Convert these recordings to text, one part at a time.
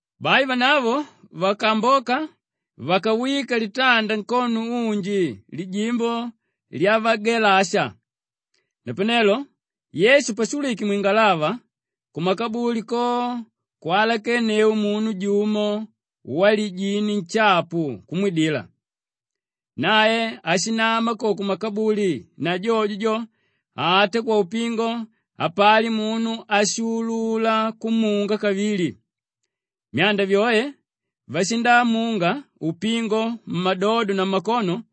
Bai vanavo vakaamboka vakawika litanda nkono unji lijimbo lyavagelasha. Napanelo Yesu pashulwike mwingalava, kumakabuli ko kwalakenneu munu jumo walijini nshapu kumwidila. Nae ashinama ko kumakabuli na jojo jo, ata kwaupingo hapali munu áshuulula kumunga kavili. Myanda vyoe vashindamunga upingo mmadodo na mmakono;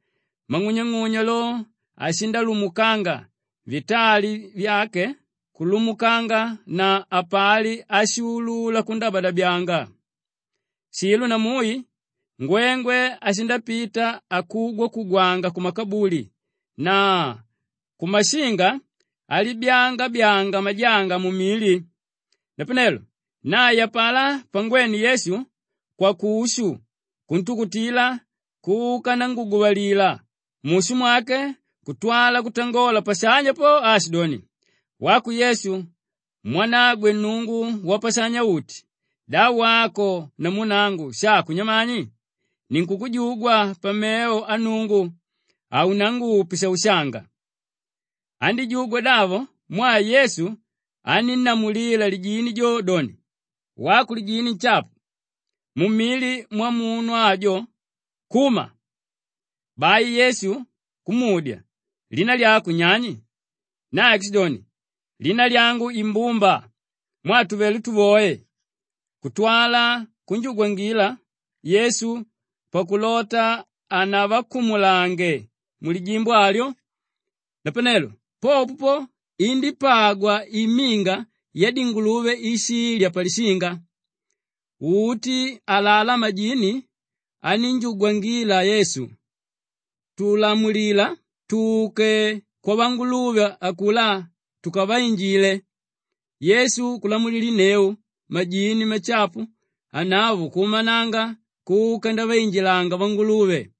mang'unyang'unya lo, ashindalundumulanga, vitali vyake kulumulanga na hapali áshimuulula kundabyadabyanga. Shilo na mui ngwengwe ashindapita akugwanga-kugwanga kumakabuli na kumashinga alibyaanga-byaanga majanga mumili. Napanelo nae apalá pangwene Yesu kwakushu kuntukutila kuka ndanguguvalila mushu mwake kutwala kutangola pashanya po aashidoni, “Wako Yesu mwanagwe Nnungu Wapashanya-uti, da wako namu nangu shako nyamani? Ninkukujugwa pamevo a Nnungu, haunangupe shaushanga.” Andíjugwa davo mwaa Yesu anínnamulila lijini jo doni, “Wako lijini nshapu, mumili mwamunu ajo, kuma!” Bai Yesu kumudya, “Lina lyako nyani?” Nae kushidoni, “Lina lyangu Imbumba mwaa tuvelé tuvoe.” Kutwala kunjugwangila Yesu pakulota hanavakumulange mulijimbo alyo. Napanelo popo po, indípagwa iminga yadinguluve íshilya palishinga. Uti alalá majini anínjugwangila Yesu, “Tulamulila tuke kwavanguluve akulá tukavainjile!” Yesu kulamulilinneu, majini mashapu anavo kuumananga kuka ndaviinjilanga vanguluve;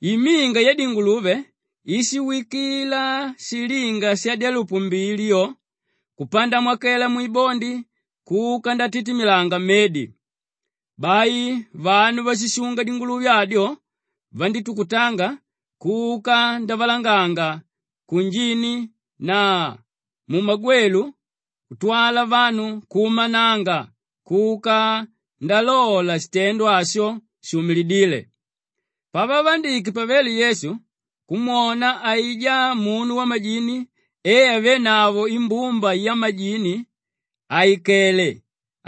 iminga yadinguluve íshiwikila shilinga shadyalupu mbili yo kupandamokela mwibondi kuka ndatitimilanga mmedi. Bai vanu váshishunga dinguluve adyo vandítukutanga kuka ndavalanganga kunjini na mmagwelu kutwala vanu kuumananga kuka ndalola shitendo asho shuumidíle. Pavavandike pavele Yesu kumwona aijá munu wamajini e avénavo imbumba yamajini àikele,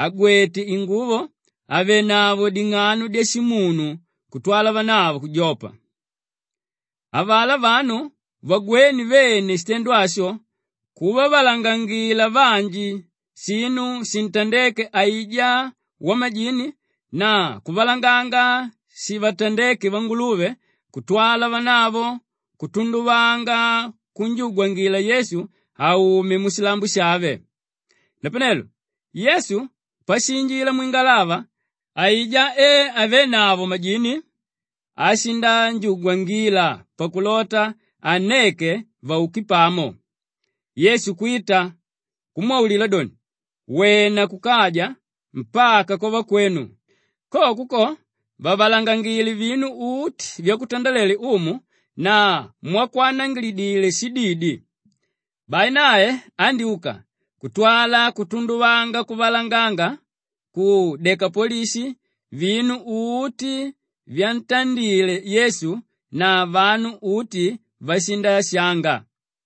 àgwete inguvo, àvenavo ding'ano dyashimunu kutwala vanavo kujopa. Avalá vanu vagwéne vene shitendo asho, kuvavalangangila vanji shinu shintandéke aijá wamajini na kuvalanganga shivatandéke vanguluve kutwala vanavo kutunduvanga kunjugwangila Yesu aume mushilambo shave. Napanelo Yesu pashiinjila mwingalava aijá e avénavo majini ashinanjugwangila pakulota anneke vauke pamo. Yesu kwita kumwaulila doni, “Wena kukaja mpaka kwavakwenu; koko ko, vavalangangile vinu uti vyakutandalele Umu na mwakwanangilidile shididi.” Bai nae andyúka kutwala kutunduvanga kuvalanganga ku Dekapolishi vinu uti vyatandile Yesu na vanu uti vashindashanga.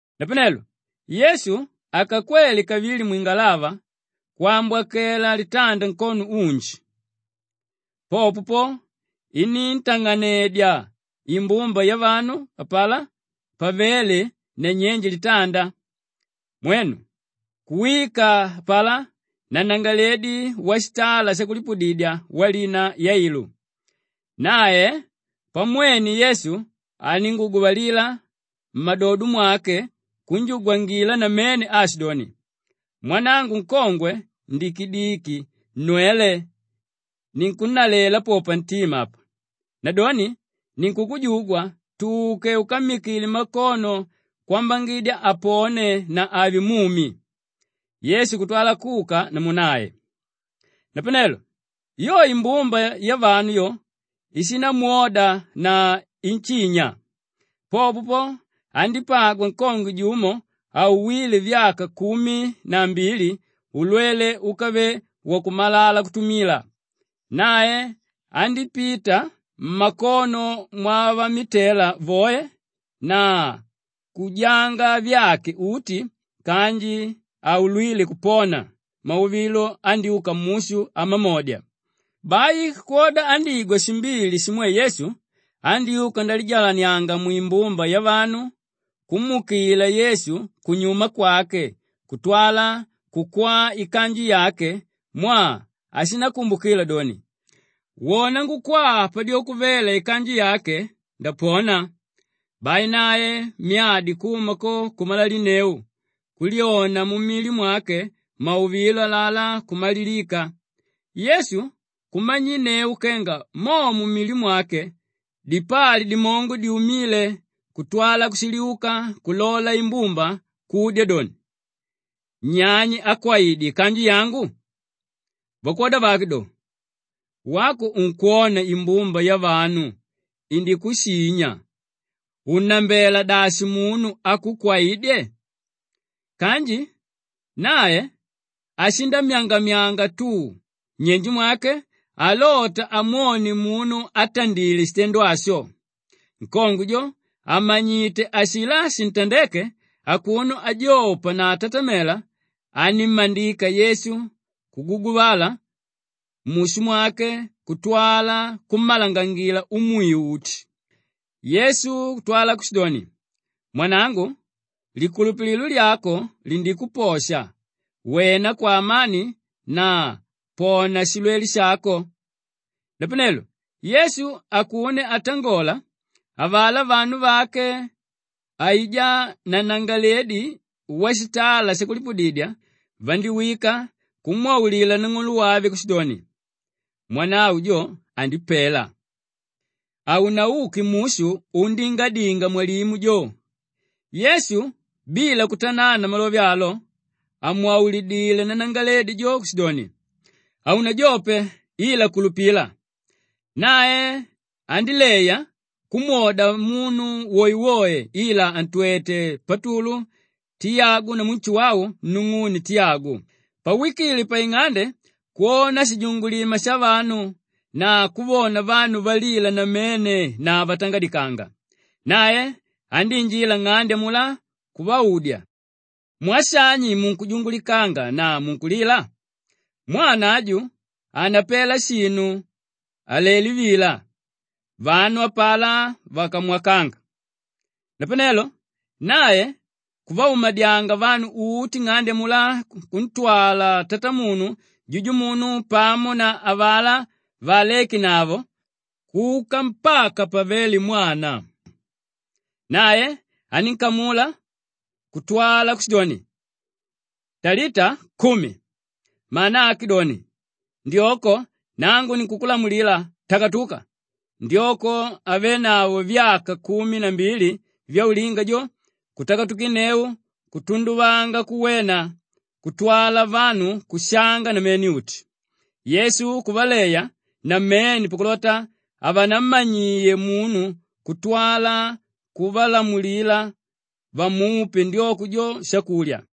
Napanelo Yesu akakwela kavili mwingalava kwambokela litanda nkono unji. Popo po, iníntang'anedya imbumba yavanu apalá pavéle nanyenje litanda. Mwenu! Kuwika apalá nanangalaledi washitala shakulipudidya walina Yailu. Nae pamwene Yesu andínguguvalila mmadodo mwake kunjugwangila namene aashidoni, “Mwanangu nkongwe ndikidiki nnwele, ninkunnalela po pantima apa! Nadoni ninkukujugwa tuke ukammikile makono kwambangidya apone na ave mumi.” Yesu kutwala kuka namu nae. Napanelo yo imbumba yavanu yo ishindamwoda na inshinya. Popo po, andípagwa nkongwe jumo auwíle vyaka kumi na mbili ulwele úkavele wakumalala kutumila. Nae andípita mmakono mwavamitela voe na kujanga vyake uti kanji haulwíle kupona; mauvilo andyúka mushu amamodya. Bai kwoda andígwa shimbili shimwe Yesu, andyúka ndalijalanianga mwimbumba yavanu kumuukila Yesu kunyuma kwake kutwala kukwaa ikanju yake mwaa ashikumbukila doni, “Wona ngukwaa padyoko vela ikanju yake ndapona.” Bai nae myadi kuma ko kumalalinneu, kulyona mumili mwake mauvilo alalá kumalilika. Yesu kumanyinneu kenga mo mumili mwake dipali dimongo dyumíle kutwala kushiliuka kulola imbumba kudya doni, “Nyani ákwaidye ikanju yangu?” Vakwoda vake do, “Wako unkwona imbumba yavanu indikushinya, unnambela dashi munu ákukwaidye?” Kanji nae ashindamyangamyanga tu nnyenje mwake alota amwone munu átandile shitendo asho. Nkongwe jo àmanyite ashilá shintandéke akuno ajopa na atatamela, anímmandika Yesu kuguguvala mushu mwake kutwala kummalangangila umwiu uti. Yesu kutwala kushidoni, “Mwanangu, likulupililo lyako lindikuposha, wena kwaamani na pona shilwele shako!” Napanelo Yesu akuno ankutangola, avalá vanu vake aijá nanangalaledi washitala shakulipudidya vandiwika kumwaulila nang'olo wave kushidoni, “Mwanavo jo andipela! Haunauke mushu undingadinga mwalimu jo.” Yesu bila kutanana malove alo, amwaulidilé nanangalaledi jo kushidoni, “Haunajope, ila kulupila.” Nae andíleya kumwoda munu woewoe ila antwete Patulu, Tiyagu namu Nshuwau nung'une Tiyagu. Pawikile paing'ande kwona shijungulima shavanu na kuvona vanu valila namene na vatangadikanga. Nae andiinjila nng'ande amulá kuvaudya, “Mwaa shani munkujungulikanga na munkulila? Mwana aju hanapela shinu alelé vila.” Vanu apalá vakamwakanga. Napanelo nae kuvaumadyanga vanu uti nng'ande amulá kuntwala tatamunu, jujumunu pamo na avalá váalekenavo kuka mpaka pavéle mwana. Nae aninkamula kutwala kushidoni, “Talita kumi!” mana ake doni, “Ndyoko, nangu ninkukulamulila, takatuka!” Ndyoko ávenavo vyaka kumi na mbili vyaulinga jo, kutakatukinneu kutunduvanga kuwena kutwala vanu kushanga namene-uti. Yesu kuvaleya namene pakulota havanammanyie munu kutwala kuvalamulila vamupe ndyoko jo shakulya.